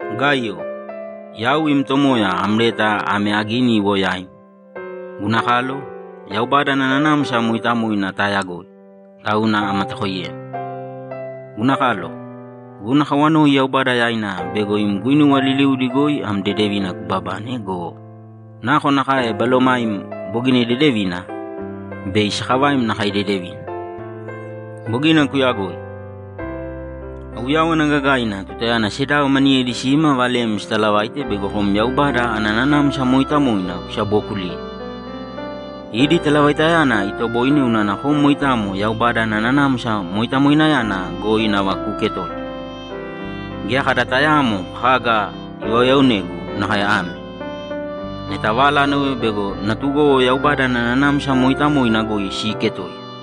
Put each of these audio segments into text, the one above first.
Gaiyo, Yau im tomoya am leta ame agini iwo yaim. Guna kalo, Yaubada ana Nanamsa Mooitamoina taayagoi, tauna amatakoiyem. Guna kalo, guna kawanoi Yaubada yaina bego im guinuwa liliudi goi am dedevina kubabane go, nakonakae balomaim bogina idedevina, bei sakavaim nakae idedevina. Bogina kuyagoi. Auyáwana gagaina tutayana sedao maniyedi sima valem sitalavaite bego kom Yaubada ana Nanamsa Mooitamoina kusabookuliye. Idi talavaitayana itoboine unana kom moitamo Yaubada ana Nanamsa Moitamoinayana goi nava kuuketoiya. Geya kada tayaamo kaga ivauyaonegu nakae ame: Neta vala anove bego natugowo Yaubada ana Nanamsa Mooitamoina goi siiketoiya!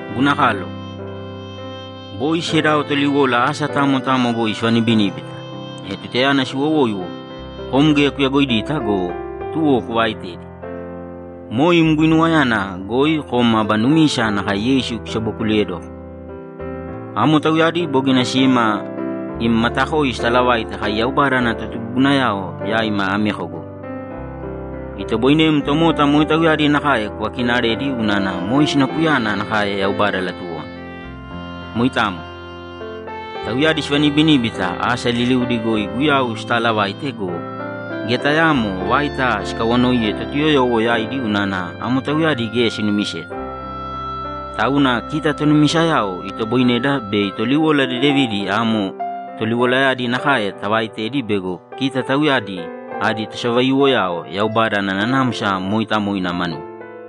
Guna kalo, boi sedao toliwola asa tamo tamo goi sivanibiníbita, e tutayana siwowoiwo, kom geya kuyagoidita go, tuwo kuvaaitedi. Moe im guinuwayana goi kom aba numisa nakae Yeisu kusabokuliyedoko. Amo tauyadi bogina sima im matakoi sitalavaite kai Yaubada ana totugugunayao yaima ameko goi. Itoboinem tomota moe tauyadi nakae kuvakinaredi unana moe sinapuyana nakae Yaubada latuwona. Moitamo. Tauyadi sivanibiníbita asa liliudi goi Guyau sitaalavaite go, geya tayaamo vaita sikawanoiye Totuyoyowo yaidi unana amo tauyadi geya sinumiseta. Tauna kita tonumisayao itoboineda bei toliwola dedevidi amo toliwolayadi nakae tavaaitedi bego kita tauyadi adi tosavaiyuwoyao Yaubada ana Nanamsa Mooitamoina manuna.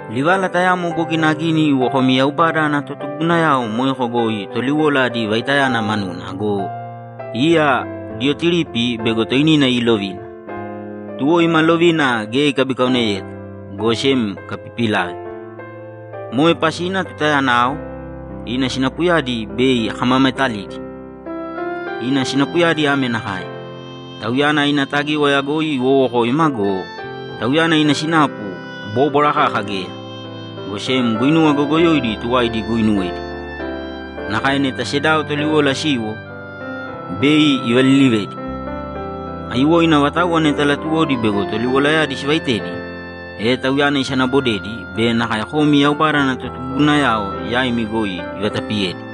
Livala tayamo bogina agini iwo komi Yaubada ana totugugunayao moeko goi toliwola adi vaitayana manuna go, iya Diyotiripi bego toinina iilovina, tuwo ima lovina geya ikabikaoneyeta, go sem ikapiipilave. Moe pasina tutayana ao, ina sinapuyadi bei akamamaetalidi. Ina sinapuyadi ame nakae: Tauyana ina tagíwaya goi iwowokoima go, tauyana ina sinapu bóbwara kaka geya, go sem guinuwa goyogoyoidi tuwaidi iguuinuwedi. Nakae neta sedao toliwola siwo, bei ivalilivedi. Aiyuwoina avatauwa neta latuwodi bego toliwolayadi sivaitedi, e tauyana isanabodedi be nakae komi Yaubada ana totugugunayao yaimi goi ivatapiyedi.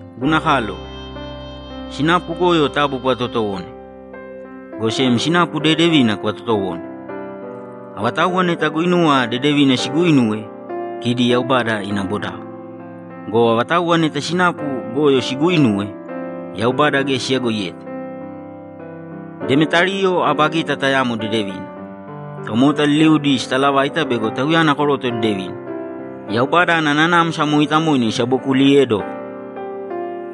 Guna kalo, sinapu goyo taabu kuvatootowōne, go sem sinapu dedevina kuvatotowōne. Avatauwa neta guinuwa dedevina siguuinuwe, kidi Yaubada ina bodao. Go avatauwa neta sinapu goyo siguuinuwe, Yaubada geya siyagoiyeta. Demetariyo aba gita tayamo dedevina. Tomota liliudi sitalavaita bego tauyana koroto dedevina. Yaubada ana Nanamsa Mooitamoina isabokuliiyedoko,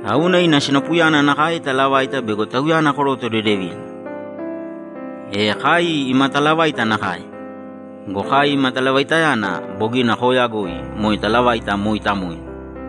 tauna ina sinapuyana nakae italavaita bego tauyana koroto dedevina. E kai ima talavaita nakae. Go kai ima talavaitayana bogina kooyagoi moe talavaita mooitamoina.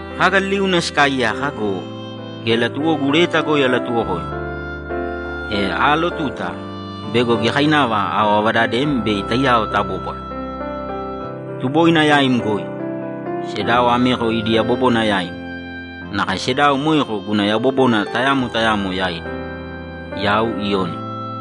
Kaga liliuna sikaaiyaka go, geya latuwogu leta goi alatuwokoim. E aalotuta bego giyakainava ao avadadem bei taiyao tabóbwara. Tuboina yaim goi! Sedao ameko idi yabobona yaim. Nakae sedao moeko guna yabobona tayamo tayamo yaidi. Yau Iyoni